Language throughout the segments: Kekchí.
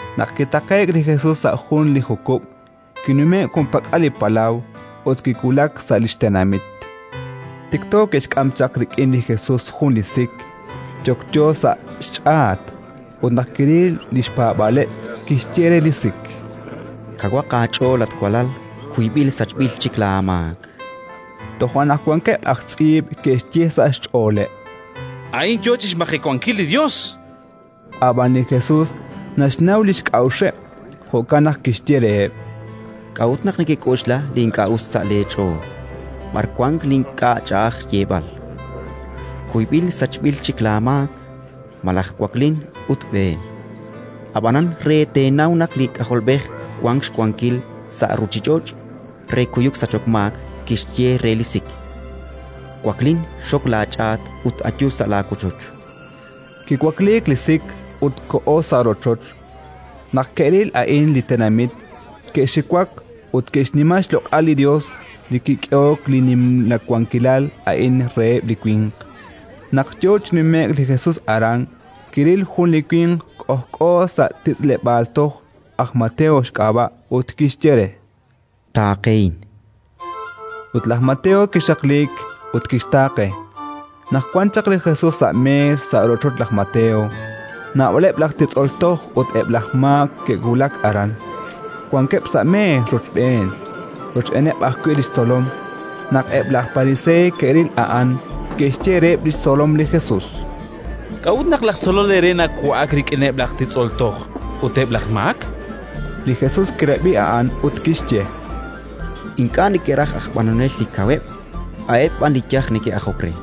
Naq kitaqe'k li Jesus sa' jun li jukub', kinume'k junpak'al li palaw ut kiwulak sa' li xtenamit. Tikto ke'xk'am chaq rik'in li Jesus jun li sik, yokyo sa' xch'aat. Ut naq kiril li xpaab'aaleb', kixye re li sik: —Kawaq aach'ool, at walal, kuyb'il sachb'il chik laamaak. Toja' naq wankeb' aj tz'iib' ke'xye sa' xch'ooleb': “A'in yo chi xmajewankil li Yos”. Ab'an li Jesus naxnaw li xk'a'uxeb'; jo'kan naq kixye reheb': —K'a'ut naq nekek'oxla li ink'a' us sa' leech'ool? B'ar wank li ink'a' ch'a'aj xyeeb'al: «Kuyb'il sachb'il chik laamaak», malaj: «Waklin ut b'een»? Ab'anan re teenaw naq li K'ajolb'ej wank xwankil sa' ruuchich'och' re kuyuk sachok maak -kixye re li sik: Waklin, xok laach'aat ut ayu sa' laawochoch. Kiwakliik li sik ut koho sa' rochoch. Naq ke'ril a'in li tenamit, ke'xiwak ut ke'xnima xloq'al li Yos li kik'ehok li nimla wankilal a'in reheb' li winq. Naq yo chi numeek li Jesus aran, kiril jun li winq k'ojk'o sa' titz'leb'aal toj, aj Mateo xk'ab'a', ut kixye re: —Taaqehin. Ut laj Mateo kixaqliik ut kixtaaqe. Naq wan chaq li Jesus sa' meex sa' rochoch laj Mateo, naab'aleb' laj titz'ol toj ut eb' laj maak ke'wulak aran, wankeb' sa' meex rochb'een, rochb'eeneb' ajwi' li xtzolom. Naq eb' laj Pariseey ke'ril a'an, ke'xye reheb' li xtzolom li Jesus: —K'a'ut naq laj tzolol eere nawa'ak rik'ineb' laj titz'ol toj ut eb' laj maak? Li Jesus kirab'i a'an ut kixye: —Ink'a' neke'raj aj b'anonel li kaweb', a'eb' b'an li yaj neke'ajok re.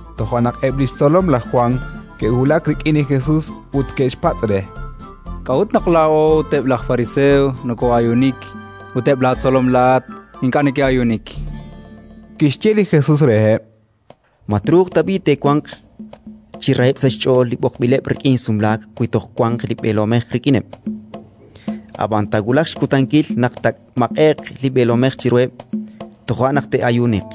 Toja' naq eb' li xtzolom laj Jwan ke'wulak rik'in li Jesus ut ke'xpatz' re: —K'a'ut naq laa'o ut eb' laj pariseey nokoo'ayuunik, ut eb' laatzolom laa'at ink'a' neke'ayuunik? Kixye li Jesus reheb': —Ma truuq tab'i' te'wanq chi raheb' sa' xch'ool li b'oqb'ileb' rik'in sumlaak wi toj wank li b'eelomej rik'ineb'? Ab'an taawulaq xkutankil naq taamaq'e'q li b'eelomej chiruheb': toja' naq te'ayuuniq.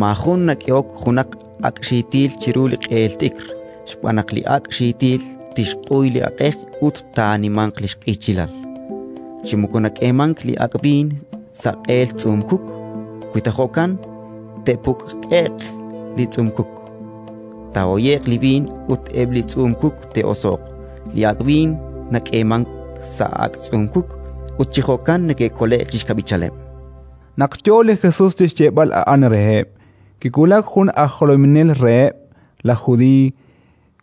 “Maajun nak'ehok junaq ak' xiitil chiru li q'eel t'ikr, xb'aan naq li ak' xiitil tixq'uy li aq'ej ut taanimanq li xq'ichilal. Chi moko nak'eemank li ak' b'iin sa' q'eel tz'uum-kuk. Wi ta jo'kan, te'puk'e'q li tz'uum-kuk, taahoye'q li b'iin ut eb' li tz'uum-kuk te'oso'q. Li ak' b'iin nak'eemank sa' ak' tz'uum-kuk, ut chi jo'kan neke'kole'k chi xkab'ichaleb'”. Naq yo li Jesus chi xyeeb'al a'an reheb', kiwulak jun aj jolominel reheb' laj Judiiy,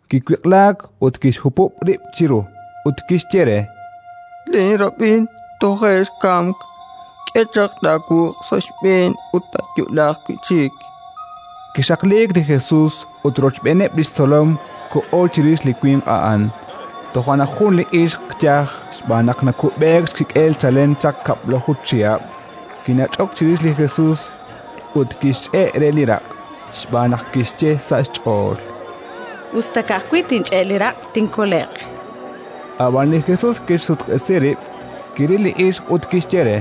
kiwiq'laak ut kixhupub' rib' chiru, ut kixye re: —Linrab'in toje' xkamk. K'e chaq laawuq' sa' xb'een ut taayo'laaq wi' chik. Kixaqliik li Jesus ut rochb'eeneb' li xtzolom koho chirix li winq a'an. Toja' naq jun li ixq yaj xb'aan naq nakub'eek xkik'el chalen chaq kab'laju chihab', kinach'ok chirix li Jesus ut kixch'e' re li raq', xb'aan naq kixye sa' xch'ool: “Us ta ka'ajwi' tinch'e' li raq', tinkole'q”. Ab'an li Jesus kixsutq'isi rib', kiril li ixq ut kixye re: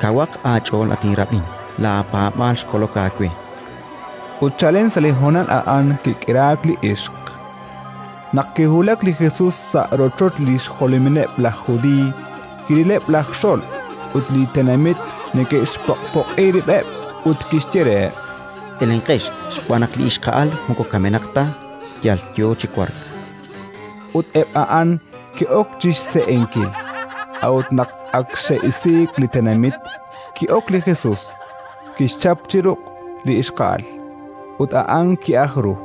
—Kawaq aach'ool, at inrab'in, laapaab'aal xkolok aawe. Ut chalen sa' li honal a'an kik'iraak li ixq. Naq kiwulak li Jesus sa' rochoch li xjolomileb' laj Judiiy, kirileb' laj xolb' ut li tenamit neke'xpoqoqi rib'eb', ut kixye reheb': —Elenqex, xb'aan naq li ixqa'al moko kamenaq ta, yal yo chi wark. Ut eb' a'an ke'ok chi xse'enkil. A'ut naq ak xe'isiik li tenamit, ki'ok li Jesus, kixchap chi ruq' li ixqa'al, ut a'an ki'ajk ru.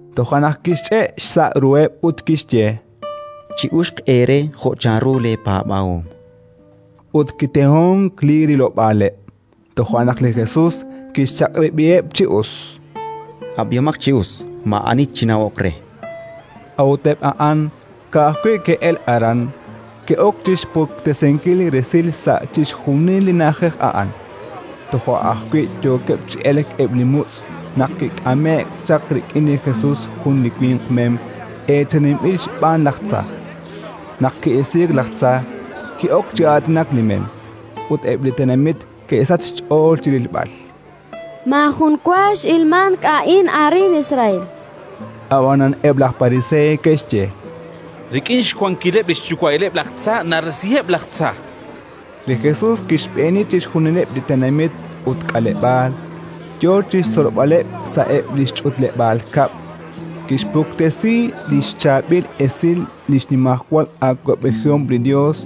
Toja' naq kixch'e' xsa' ruheb' ut kixye: —Chi'uxq eere jo' chanru leepaab'ahom. Ut kitehonk li rilob'aaleb'. Toja' naq li Jesus kixchaq'rab'iheb' chi us: —Ab'ihomaq chi us, maa'ani chinawoq re, chan. A'ut eb' a'an, ka'ajwi' ke'elk aran, ke'ok chi xpuktesinkil resil sa' chixjunil li na'ajej a'an. Tojo' ajwi' yookeb' chi elk eb' li mutz' naq kik'ame'k chaq rik'in li Jesus jun li winq mem eechaninb'il xb'aan laj tza. Naq ki'isiik laj tza, ki'ok chi aatinak li mem, ut eb' li tenamit ke'sachk xch'ool chi rilb'al: —Maajun wa x'ilmank a'in arin Israel, chankeb'. Ab'anan eb' laj Pariseey ke'xye: —Rik'in xwankilal li xyuwa'ileb' laj tza narisiheb' laj tza. Li Jesus kixb'eeni chixjunileb' li tenamit ut k'aleb'aal, yo chi xtzolb'aleb' sa'eb' li xch'utleb'aal kab'l. Kixpuktesi li xchaab'il esil li xnimajwal awab'ejihom li Yos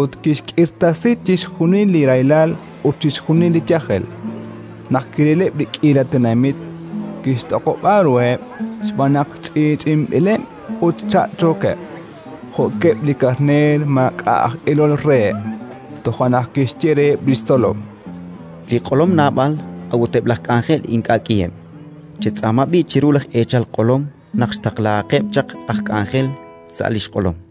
ut kixk'irtasi chixjunil li rahilal ut chixjunil li yajel. Naq kirileb' li k'iila tenamit, kixtoq'ob'a ruheb' xb'aan naq ch'i'ch'i'inb'ileb' ut cha'chookeb', jo'keb' li karneer maak'a' aj ilol reheb'. Toja' naq kixye reheb' li xtzolom: —Li q'olom naab'al, a'ut eb' laj k'anjel ink'a' k'iheb'. Chetz'aama b'i' chiru laj eechal q'olom naq xtaqlahaqeb' chaq aj k'anjel sa' li xq'olom.